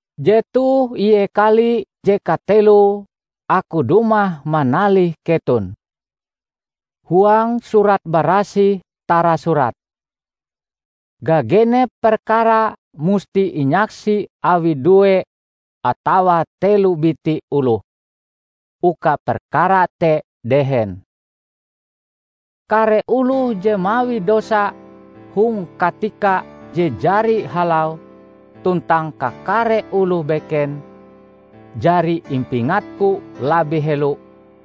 Jetoh ie kali je kateloe aku dumah manalih keton. Huang Surat Barasih tarasurat, "Gagenep perkara musti inyaksi awi due atawa telo biti oloh, uka perkara te dehen." Kare oloh je mawi dosa hong katika je jari halau tuntang kakare oloh beken, jari impingatku labih helo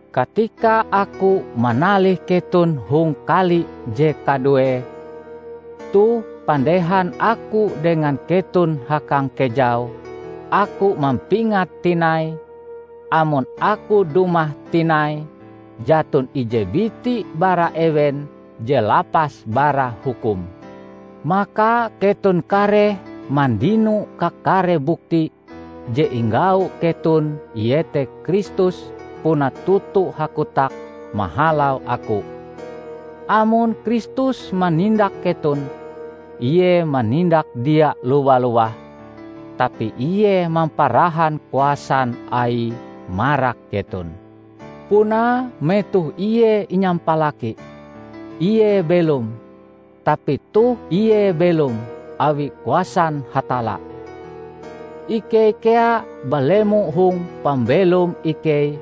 katika aku manalih keton hong kali je kaduee. Toh, pandehan aku dengan keton hakangkejau, aku mampingat tinai, amon aku dumah tinai, jaton ije biti bara ewen je lapas bara hukum. Maka keton kareh mandino kakare bukti je inggau keton iete Kristus puna toto hakotak mahalau aku. Amon Kristus manindak keton, ie manindak dia lowa-lowah, tapi ie mamparahan kuasan Aie marak keton. Punae metoh ie inyampalaki, ie belom, tapi toh ie belom awi kuasan Hatalla. Ikei kea balemo hong pambelom ikei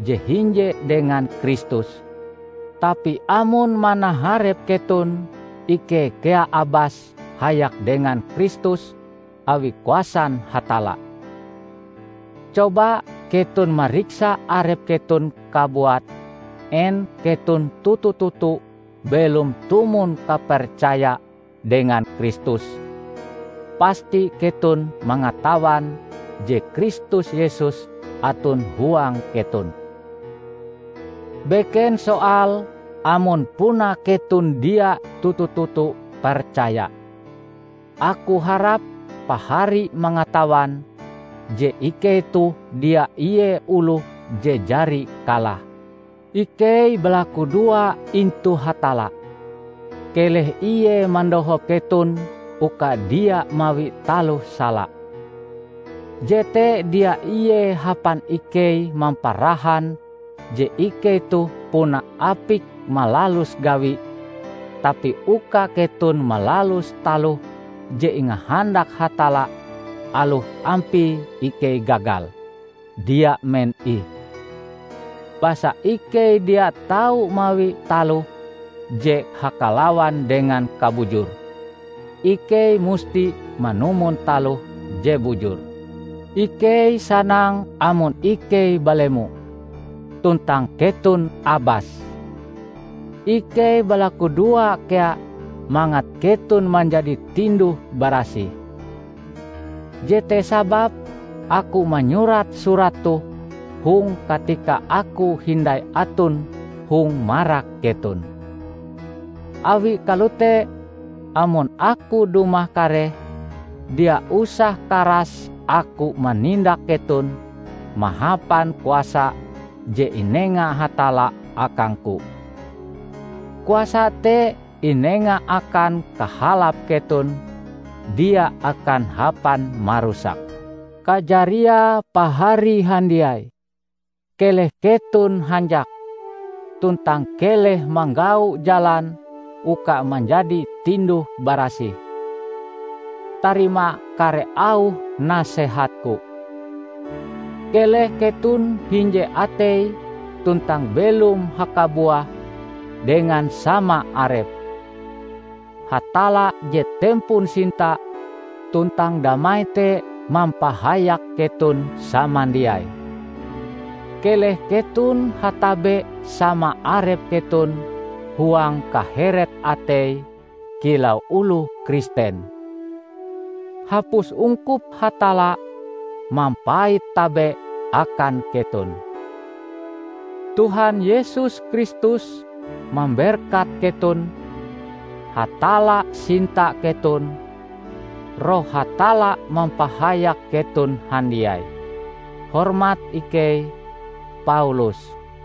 je hinje dengan Kristus, tapi amon manaharep keton, ikei kea abas hayak dengan Kristus awi kuasan Hatalla. Coba keton mariksa arep keton kabuat en keton toto-toto belom tumon kapercaya dengan Kristus! Pasti keton mangatawan je Kristus Yesus aton huang keton! -- beken soale amon puna keton dia toto-toto percaya. Aku harap pahari mangatawan je ikei toh dia ie oloh je jari kalah. Ikei balakudoa intu Hatalla, keleh ie mandohop keton uka dia mawi taloh sala. Jete dia ie hapan ikei mamparahan je ikei toh puna apik malalus gawi, tapi uka keton malalus taloh je ingahandak Hatalla aloh ampie ikei gagal, dia men ih! Basa ikei dia tau mawi taloh je hakalawan dengan kabujur; ikei musti manumon taloh je bujur. Ikei sanang amon ikei balemo, tuntang keton abas. Ikei balakudoa kea mangat keton manjadi tinduh-barasih. Jete sababe aku manyurat surat toh hong katika aku hindai aton hong marak keton. Awi kalote, amon aku dumah kareh, dia usah karas aku manindak keton mahapan kuasa je inenga Hatalla akangku. Kuasa te inenga akan kahalap keton dia akan hapan marusak. Kajariae, pahari handiai, keleh keton hanjak, tuntang keleh manggau jalan uka manjadi tinduh-barasih. Tarima kare auh nasehatku. Keleh keton hinje atei tuntang belom hakabuah dengan sama arep. Hatalla je tempon sinta tuntang damai te mampahayak keton samandiai. Keleh keton hatabe sama arep keton huang kaheret atei kilau oloh Kristen. Hapus ungkup Hatalla mampait tabe akan keton. Tuhan Yesus Kristus mamberkat keton, Hatalla sinta keton, Roh Hatalla mampahayak keton handiai! Hormat ikei, Paulus